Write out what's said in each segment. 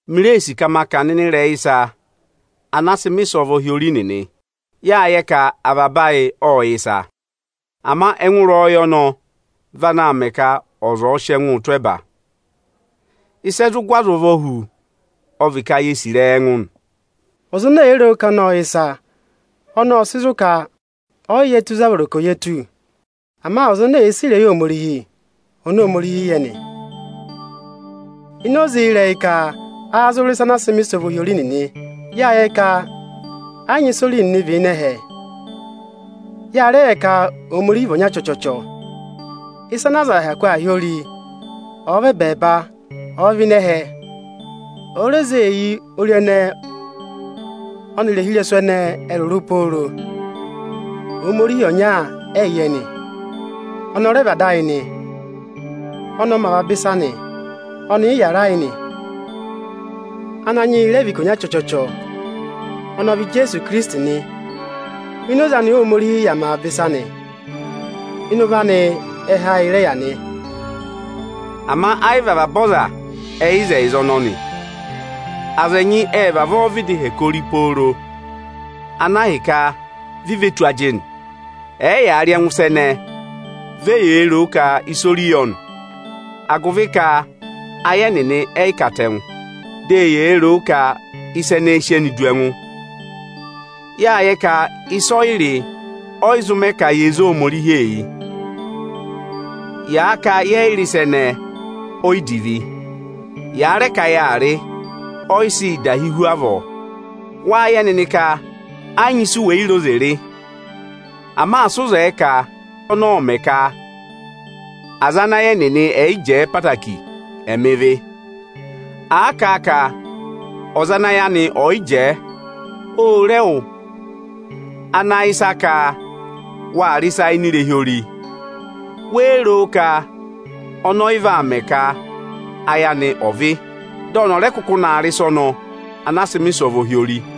Mi ree sì ka ma kà ọ̀nọ̀ ịnị ịrẹyị ịsa ana a sị mẹ̀ ịsọvọ yị ori nịnị. Yâ yẹ ka avaba ayị ọ́ yẹ ịsa. Ama ẹngụ ịrẹyọyẹ ọnọ vị ana aā mẹ ka za ọ̀ọ sị ẹngụụ tụ́ ẹba. Ịsị ẹ zụ gụ ọza ụvọ hu, ọ vị ka, ye sì ịrẹyị ẹngụ nị. Ọza ene èe ro ka ọnị ộ yẹ ịsa, ọnọọ ộ sị zụ ka ọọ̀ yị yẹ tù ịzị a vọrọ ka ọ̀ yẹ tù. Ama ọza ene èe sì ịrẹyị Ohomorihi, ọnị Óhomorihi yẹ nị Ini oze ịrẹyị ka áá zụ rị ịsa ana a sị mẹ̀ ịsọvọ yị ori nịnị, yâ yẹ ka ẹ yị nyị ịsị ori nịnị vị ịnị ẹhẹ. Ya rẹ yẹ ka Ohomorihi vị ọnya chọchọchọ. Ịsa ana aza hyakụ aa hị́ ori ọ̀ọ vị ẹbẹẹba, ọ̀ọ vị ịnị ẹhẹ, òo re zee eyi ori ẹnẹẹ ẹnịrị ohirẹsụ ẹnịnị ẹ̀ rụrụ pooro, Ohomorihi ọnya ẹyị yẹ nị. Ọnị ọ rẹ vị Ada ayị nị. Ọnị ọ mẹ avaba ịsa nị, ọnị ị yàra yị nị. Ananyị yị rẹ vị ikonya chọchọchọ. Ọnị ọ vị Ijeesu ohinọyị oni Ohomorihi nyị ka ọ̀ dọ yị há nị. Ini oze anị Óhomorihi yà mẹ avaba ịsa nị. Ịnị ụvọ anị ẹhẹ ayị rẹ yà nị. Ama ẹ yị vị avaba aza ẹ yẹ ịzẹyịza ọnọnị. Aza ẹnyị ệ vavọọ hẹkẹ ori pooro, ana hi ka vi ve tù ajịnị, ẹ̀ẹ yaa rị ẹngụ ịsa ẹnẹẹ, vi eyee ro o ka ịsa ori yọ nị. Agụvị ka ayị ẹnịnị ẹ yị katẹngụ, dị eyee ro o ka ịsa ẹnẹẹ ẹ sị ẹnị du ẹngụ. Yâ yẹ ka ịsọyịrị ọ yị zụ mẹ ka ye zé Ohomorihi eyi. Yâ ka, yẹ yị rị ịsa ẹnẹẹ, o yi divi. Yâ rẹ ka yaa rị, ọ yị sị yị dahi hu avọọ. Wâ yẹ nịnị ka ẹ yị nyị isu wè yi re oze rị. Ama asị ụ zẹẹ ka ọnọọ ọ̀ mẹ ka aza ana ayị ẹnịnị ẹ̀ yị jẹẹ ẹtẹẹtẹrẹ, ẹ̀ mẹ ịvị! À kà a ka ọza ana ayị anị ọ̀ yị jẹẹ ô re ẹwụ ana yẹ ịsa ka waa rị ịsa ini irehi ori; wéé ro ka ọnọọ ọ yị vaa mẹ ka ayị anị ọ̀ vị́, dị ọnị ọ̀ rẹ kụkụ naa rị ịsa ọnọọ anaa sị mẹ̀ ịsọvọ hi ori?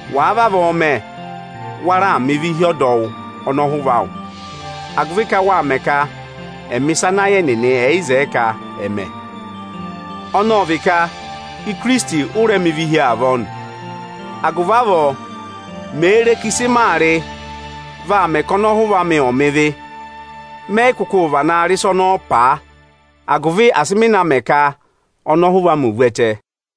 Wàa vavọọ mẹ, wa raà mẹ ịvị hi ọdọwụ ọnọhụva awụ, agụvị ka wâ mẹ ka ẹ̀ mẹ̀ ịsa ana ayị ẹnịnị ẹ̀ yị zẹẹ ka ẹ̀ mẹ. Ọnị ọ vị ka ohinọyị oni Ohomorihi nyị ka ọ̀ dọ yị há, ụ rẹ mẹ ịvị hi avọọ nị. Agụvị avọọ, mê re ka ịsị maa rị, vaa mẹ ka ọnọhụva amị ọ̀ mẹ ịvị, mẹ yị kụkụụ vanaa rị ịsa ọnọọ paa, agụvị asị mị na mẹ ka ọnọhụva amị ò vu ẹtẹ.